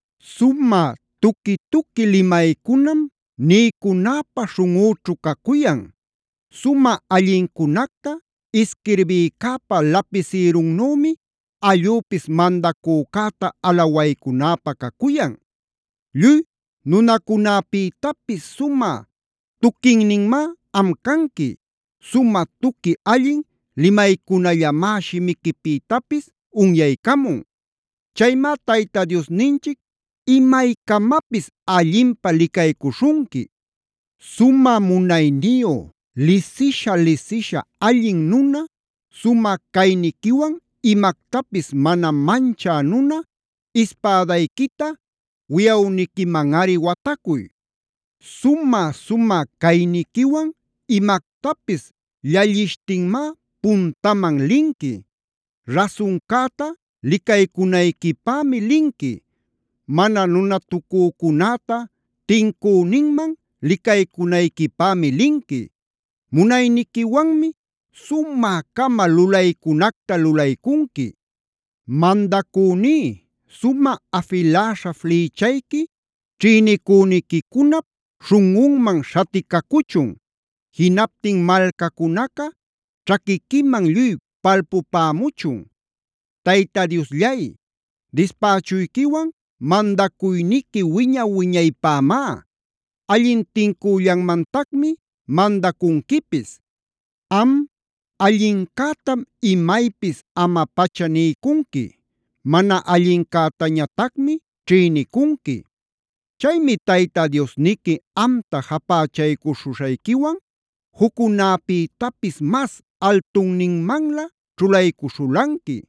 Sumä tuqui-tuqui limaycunam niycunäpä śhunꞌüćhu cacuyan. Sumä allincunacta isquirbïcäpa lapisïrunnümi allüpis mandacücäta alawaycunäpä cacuyan. Lluy nunacunäpïtapis sumä tuquinninmá am canqui. Sumä tuqui allin limaycunallamá shimiquipïtapis unyaycamun. Chaymá Tayta Diosninchic imaycamapis allinpä licaycuśhunqui. Sumä munayniyu, lisisha-lisisha allin nuna, sumä cayniquiwan imactapis mana manchä nuna ispädayquita wiꞌawniquimanꞌari watacuy. Sumä-sumä cayniquiwan imactapis llallishtinmá puntaman linqui. Rasuncäta licaycunayquipämi linqui. Mana nunatucücunäta tincüninman licaycunayquipämi linqui. Munayniquiwanmi sumä-cama lulaycunacta lulaycunqui. Mandacüní, sumä afiläśha flïchayqui ćhïnicüniquicunap śhunꞌunman śhaticacuchun. Jinaptin malcacunaca ćhaquiquiman lluy palpupämuchun. Tayta Diosllay, dispächuyquiwan mandacuyniqui wiña-wiñaypämá. Allin tincüllanmantacmi mandacunquipis. Am, allincätam imaypis ama-pacha niycunqui. Mana allincätañatacmi ćhïnicunqui. Chaymi Tayta Diosniqui amta japächaycuśhuśhayquiwan juccunäpïtapis mas altunninmanlä ćhulaycuśhulanqui.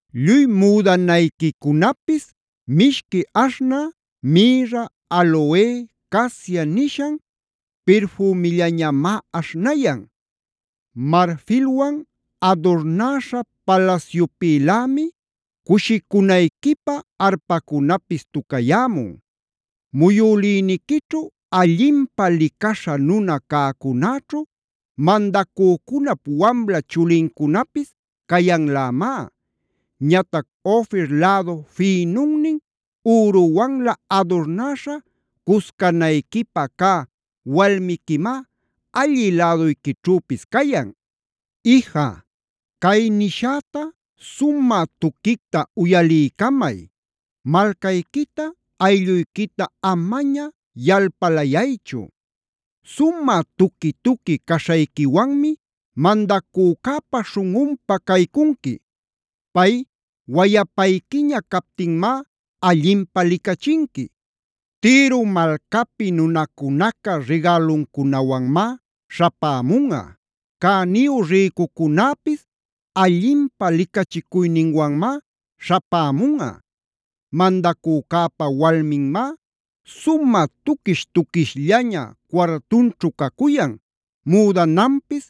Lluy müdanayquicunapis mishqui aśhnä mïrra, aloe, casia nishan pirfümillañamá aśhnayan. Marfilwan adurnäśha palasyupïlämi cushicunayquipä arpacunapis tucayämun. Muyülïniquićhu allinpä licaśha nuna cäcunäćhu, mandacücunap wamla chulincunapis cayanlämá. Ñatac Ofir lädu fïnunnin üruwanlä adurnäśha cuscanayquipä cä walmiquimá allï läduyquićhüpis cayan. Ija, cay nishäta sumä tuquicta uyaliycamay: Malcayquita, aylluyquita amaña yalpalayaychu. Sumä tuqui-tuqui caśhayquiwanmi mandacücäpa śhunꞌunpa caycunqui. Pay wayapayquiña captinmá allinpä licachinqui. Tiro malcapi nunacunaca rigäluncunawanmá śhapämunꞌa. Cäniyu rïcucunäpis allinpä licachicuyninwanmá śhapämunꞌa. Mandacücäpa walminmá sumä tuquish-tuquishllaña cuartunćhu cacuyan, müdananpis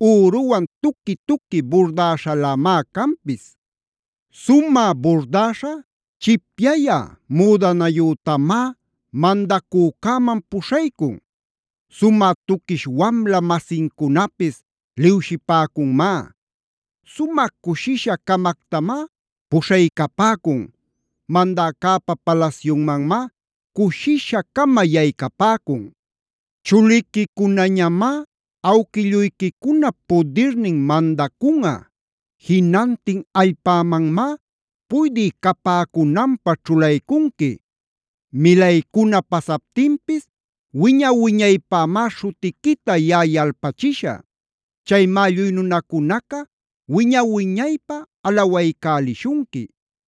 üruwan tuqui-tuqui burdäśhalämá canpis. Sumä burdäśha chipyayä müdanayütamá mandacücäman puśhaycun. Sumä tuquish wamla-masincunapis liwshipäcunmá. Sumä cushisha-camactamá puśhaycapäcun. Mandäcäpa palasyunmanmá cushisha-cama yaycapäcun. Chuliquicunañamá awquilluyquicunap pudirnin mandacunꞌa. Jinantin allpämanmá puydï capäcunanpä ćhulaycunqui. Milaycuna pasaptinpis wiña-wiñaypämá śhutiquita yaꞌa yalpachishä. Chaymá lluy nunacunaca wiña-wiñaypä alawaycälishunqui.